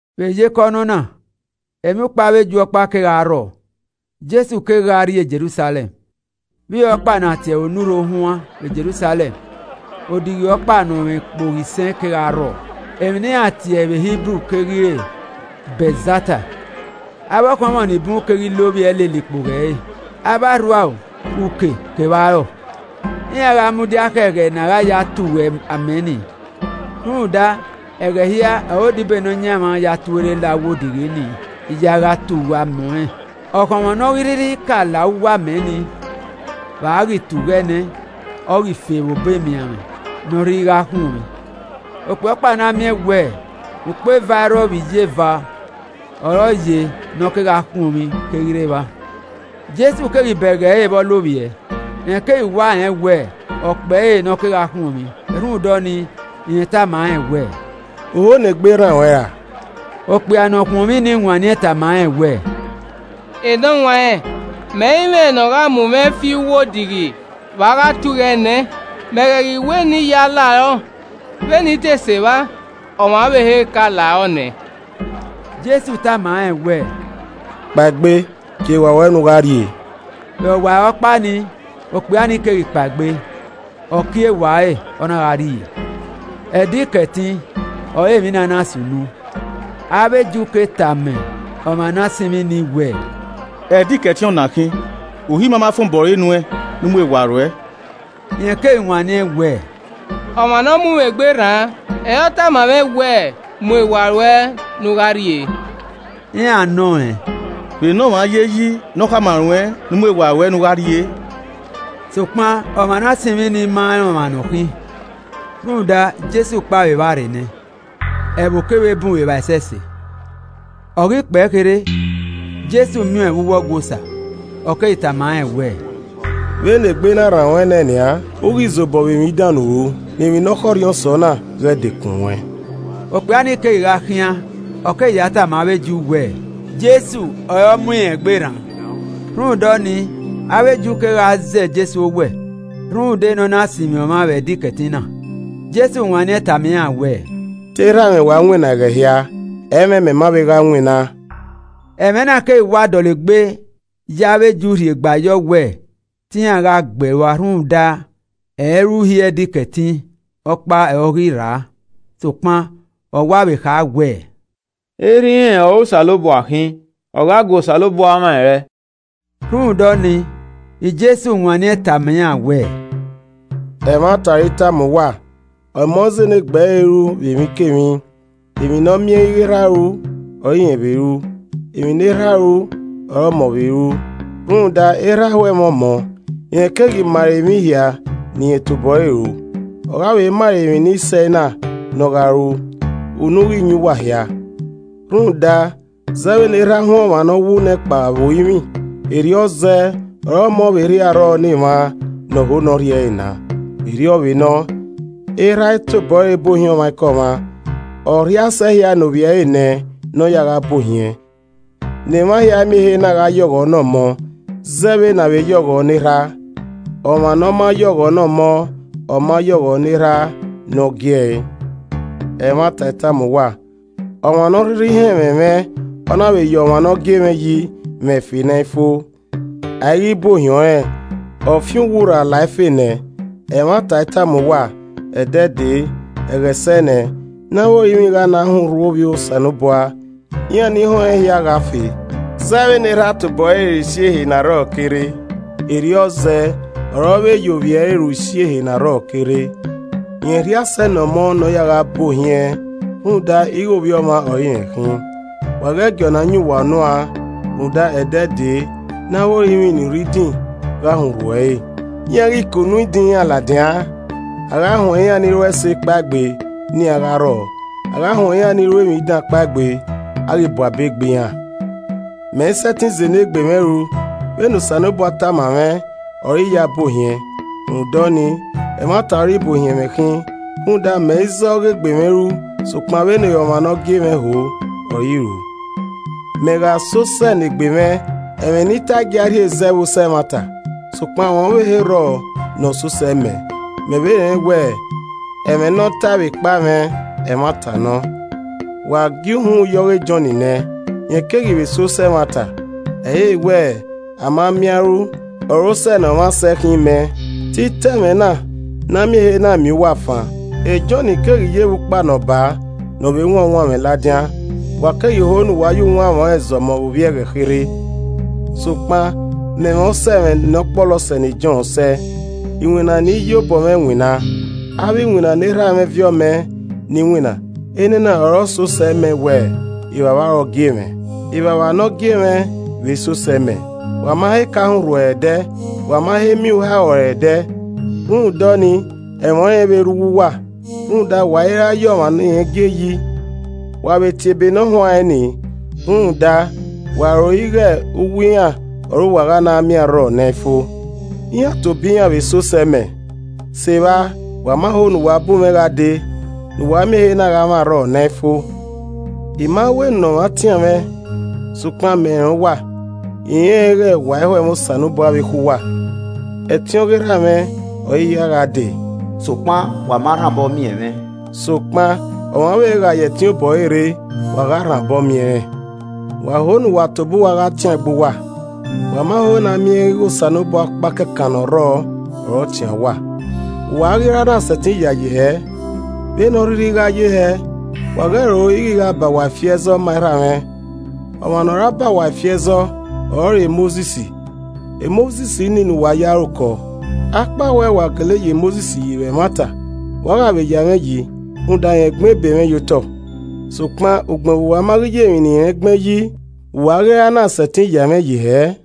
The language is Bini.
Vbe iyeke ọnọna emwiukpo avbe Ju ọkpa kegha rrọọ, Jesu keghi gha rrie Jerusalẹm. Vbe ihe ọkpa ne a tie ẹre Onurho Ohuan vbe Jerusalẹm odighi ọkpa ne ọ mwẹ ikpogho isẹn kegha rrọọ, emwi ne iran tie ẹre vbe Hibru keghi re Betzata. Avbe ọkhọnmwọ ni bun keghi lovbiẹ lele ikpogho ẹre, avbe arhuaro, uke kevbe arọe. [Iran gha mudia khẹ ẹghẹ ne a gha ya tughu amẹ ni. Rhunmwuda ẹghẹ hia ọre odibo e Nọyaẹnmwa ya tuorre la uwu odighi nii ya gha tughu amẹ ọnrẹn, ọkhọnmwọ ne ọ ghi rhirhi ka la uwu amẹ nii vbe a ghi tughu ẹe nẹ, ọ ghi fe vbe obọ emianmwẹ ne ọ rhirhi a gha khuọnmwi.] Okpia ọkpa ne a miẹn wẹ ukpo eva irrọ vbe iyeva ọre ọ ye ne ọ kegha khuọnmwi keghi rre evba. Jesu keghi bẹghe ẹre vbe ọ lovbiẹ, rẹn keghi wa rẹn wẹẹ ọkpẹre ne ọ kegha khuọnmwi, rhunmwuda ọnii, rẹn tama rẹn wẹẹ, “U ho ne egbe rran ruẹn ra?” Okpia ne ọ khuọnmwi ni wanniẹn tama rẹn wẹẹ, “Enọwanrẹn mẹ i mwẹ ne ọ gha mu mwẹ fi uwu odighi vbe a gha tughu ẹe nẹ, mẹ ghẹ ghi wẹ ne I ya larọ, vbene I te sẹ evba, ọmwa ọvbehe ka la rọ nẹ.” Jesu tama rẹn wẹẹ, “Kpaegbe, kie ewa ruẹ ne u gha rrie.” Vbe ọwarọkpa nii, okpia ni keghi kpaegbe, ọ kie ewa ẹre, ọ na gha rrie. Ẹdẹ Ikẹtin ọre emwi na na sunu. Ẹ re ivbi Eju na tama ọmwa ne a sinmwi nii wẹẹ, “Ẹdẹ Ikẹtin ọ na khin. Uhi ima ma fan obọ ẹre nuẹn ne u mu ewa ruẹ.” Rẹn keghi wanniẹn wẹẹ, “Ọmwa ne ọ mu mwẹ egbe rran ọre ọ tama mwẹ wẹẹ, ‘Mu ewa ruẹ ne u gha rrie.’” Iran nọ rẹn, “Vbe enọmwa ye yi ne ọ khama ruẹn ne u mu ewa ruẹ ne u gha rrie?” Sokpan ọmwa ne a sinmwi ni ma rẹn ọmwa ne ọ khin, rhunmwuda Jesu kpao vbe evba rre nẹ, ẹvbo kevbe bun vbe evba ẹsẹse. Ọ ghi kpẹe kherhe, Jesu miẹn ọẹn vbe uwu Ọgua Osa, ọ keghi tama rẹn wẹẹ, “Vbe ne egbe na rran ruẹ nẹ nian, u ghi zobọ vbe emwi dan ne u ru, ne emwi ne ọ khọrhiọn sẹ ọna ghẹ dekun ruẹn.” Okpia ni kegha khian, ọ keghi ya tama avbe Ju wẹẹ, “Jesu ọre ọ mu irẹn egbe rran.” Rhunmwuda ọnii, avbe Ju kegha zẹ Jesu owẹ rhunmwuda ne ọ na sinmwi ọmwa vbe Ẹdẹ Ikẹtin na. Jesu wanniẹn tama iran wẹẹ, “Te erha mwẹ wa winna ẹghẹ hia, ẹ i mwẹ mẹ ma vbe gha winna.” Ẹmwẹ na keghi wa dọlegbe ya avbe Ju rhie gba yọ wẹ te iran gha gbe ẹe rua rhunmwuda ẹ i re uhi Ẹdẹ Ikẹtin ọkpa ọre ọ ghi rra, sokpan ọ wa vbe kha wẹẹ, “Erha irẹn ọre Osanobua khin, ọ gha gu Osanobua mwa ẹrrẹe.” Rhunmwuda ọnii, Jesu wanniẹn tama iran wẹẹ, “Ẹmwata ọre I tama uwa, Ọmọ izẹ enegbe ẹre ru vbe emwikemwi, emwi ne ọ miẹn ighe Erha ru ọre irẹn vbe ru. Emwi ne Erha ru ọre Ọmọ vbe ru. Rhunmwuda Erha ho ẹmwẹ Ọmọ, rẹn keghi ma ẹre emwi hia ne irẹn tobọ ẹre ru. Ọ gha vbe ma rẹ emwi ni sẹ ena ne ọ gha ru, unu ghi yan uwa hia. Rhunmwuda zẹ vbene erha huẹn ọmwa ne ọ wu nẹ kpao vbe orinmwi, erriọ zẹẹ ọre Ọmọ vbe rhie arrọọ ne emwa ne ọ ho ne ọ rhie na. Erriọ vbe nọ, Erha i tobọ ẹre bu ohiẹn ọmwaikọmwa, ọ rhie asẹ hia ne ovbi ẹre nẹ ne ọ ya gha bu ohiẹn. Ne emwa hia miẹn ehe na gha ye ọghọ ne Ọmọ zẹ vbene avbe ya ọghọ ne Erha. Ọmwa ne ọ ma ye ọghọ ne Ọmọ ọ ma ya ọghọ ne Erha ne ọ gie ẹe. “Ẹmwata I tama uwa, ọmwa ne ọ rhirhi họn ẹmwẹ mwẹ ọ na vbe ya ọmwa ne ọ gie mwẹ yi, mwẹ ẹfe ne ẹ i fo. A i ghi bu ohiẹn ọnrẹn, ọ fian uwu rra la ẹfe nẹ. Ẹmwata I tama uwa, ẹdẹ dee, ẹghẹ sẹ nẹ, ne avbe orinmwi gha na họn urhu Ovbi Osanobua, iran ni họn ẹn hia gha fe. Zẹ vbene Erha tobọ ẹre re isi ehe ne arrọọ ke rre, erriọ zẹ ọre ọ vbe ya Ovbi ẹre ru isi ehe ne arrọọ ke rre. Rẹn rhie asẹ ne Ọmọ ne ọ ya gha bu ohiẹn rhunmwuda ighẹ Ovbi Ọmwa ọre irẹn khin. Wa ghẹ gie ọna yan uwa unu an, rhunmwuda ẹdẹ dee ne avbe orinmwi ni rre idin gha họn urhu ẹre, iran ghi ke unu idin iran ladian, a gha huẹn iran ni ru ẹse kpaegbe ne iran gha rrọọ, a gha huẹn iran ni ru emwi dan kpaegbe, a ghi bu abe gbe iran. “Mẹ i sẹtin zẹ enegbe mwẹ ru, vbe ne Osanobua tama mwẹ ọre I ya bu ohiẹn, rhunmwuda ọnii, ẹmwata ọre ibuohiẹn mwẹ khin rhunmwuda mẹ i zẹ ọghe egbe mwẹ ru, sokpan vbene ọmwa ne ọ gie mwẹ ho, ọre I ru. “Mẹ gha sẹ osẹe ne egbe mwẹ, ẹmwẹ ne I tae i gia rhie zẹ vbe osẹe ẹmwata. Sokpan ọmwa ọvbehe rrọọ ne ọ sẹ osẹe mẹ, mẹ vbe rẹn wẹẹ, ẹmwẹ ne ọ tae vbe ekpa mwẹ, ẹmwata nọ. Wa gie uhunmwu ye ọghe Jọn nẹ, rẹn keghi vbe sẹ osẹe ẹmwata. Ẹ i re wẹ, a ma miẹn a i ru ọre osẹe ne ọmwa sẹ khin mẹ, te I ta ẹmwẹ na ne a miẹn ehe na miẹn uwa fan. Jọn keghi ye vbe ukpa ne ọ baa, ne ọ vbe wan uwanmwẹ ladian, wa keghi ho ne uwa ya uwanmwẹ ọnrẹn zọmọ vbe ovbi e ẹghẹ kherhe. Sokpan mẹ mwẹ osẹ mwẹ ne ọ kpọlọ sẹ ne Jọn sẹe: I winna ne I ye obọ mwẹ winna, avbe iwinna ne Erha mwẹ viọ mẹ ne I winna, enena ọre ọ sẹ osẹe mẹ wẹẹ Evbavba ọre ọ gie mwẹ. Evbavba ne ọ gie mwẹ vbe sẹ osẹe mẹ. Wa ma he ka họn urhu ẹre ẹdẹ, wa ma he miẹn uharo ẹre ẹdẹ. Rhunmwuda ọnii ẹmwẹ ọnrẹn i vbe rre uwu uwa, rhunmwuda wa i ra ya ọmwa ne irẹn gie yi. Wa vbe tie Ebe ne ọ huanrẹn ni rhunmwuda wa ro ighẹ uwu iran ọre uwa gha na miẹn arrọọ ne ẹ i fo. Iran tobọ iran vbe sẹ osẹe mẹ. Sevba wa ma ho ne uwa bu mwẹ gha dee ne uwa miẹn ehe na gha mwẹ arrọọ ne ẹ i fo. “I ma wẹ ne ọmwa tian mwẹ. Sokpan mẹ rẹn uwa. I rẹnrẹn ighẹ wa i ho ẹmwẹ Osanobua vbe ekhọe uwa. Ẹtin ọghe Erha mwẹ ọre I ya gha dee, sokpan wa ma rhan obọ miẹn mwẹ, sokpan ọmwa ọvbehe gha ya ẹtin obọ ẹre rre, wa gha rhan obọ miẹn rẹn. Wa ho ne uwa tobọ uwa gha tian egbe uwa, wa ma ho ne a miẹn ighẹ Osanobua ọkpa kẹkan ne ọ rrọọ ọre ọ tian uwa, vbe uwa a ghi ra na sẹtin yayi hẹẹ? Vbene ọ rhirhi gha ye hẹ, wa ghẹ ro ighẹ I gha ba uwa ifi ẹzọ ma Erha mwẹ. Ọmwa ne ọ ra ba uwa ifi ẹzọ ọrọre Mosis. Mosis nii ne uwa ye aro kọ. Akpawẹ wa gele ya Mosis yi vbe ẹmwata, wa gha vbe ya mwẹ yi rhunmwuda rẹn gbẹn ebe mwẹ ye otọ. Sokpan ugbẹn vbe uwa ma ghi ya emwi ne irẹn gbẹn yi, vbe uwa a ghi ra na sẹtin ya ẹmwẹ mwẹ yi hẹẹ?”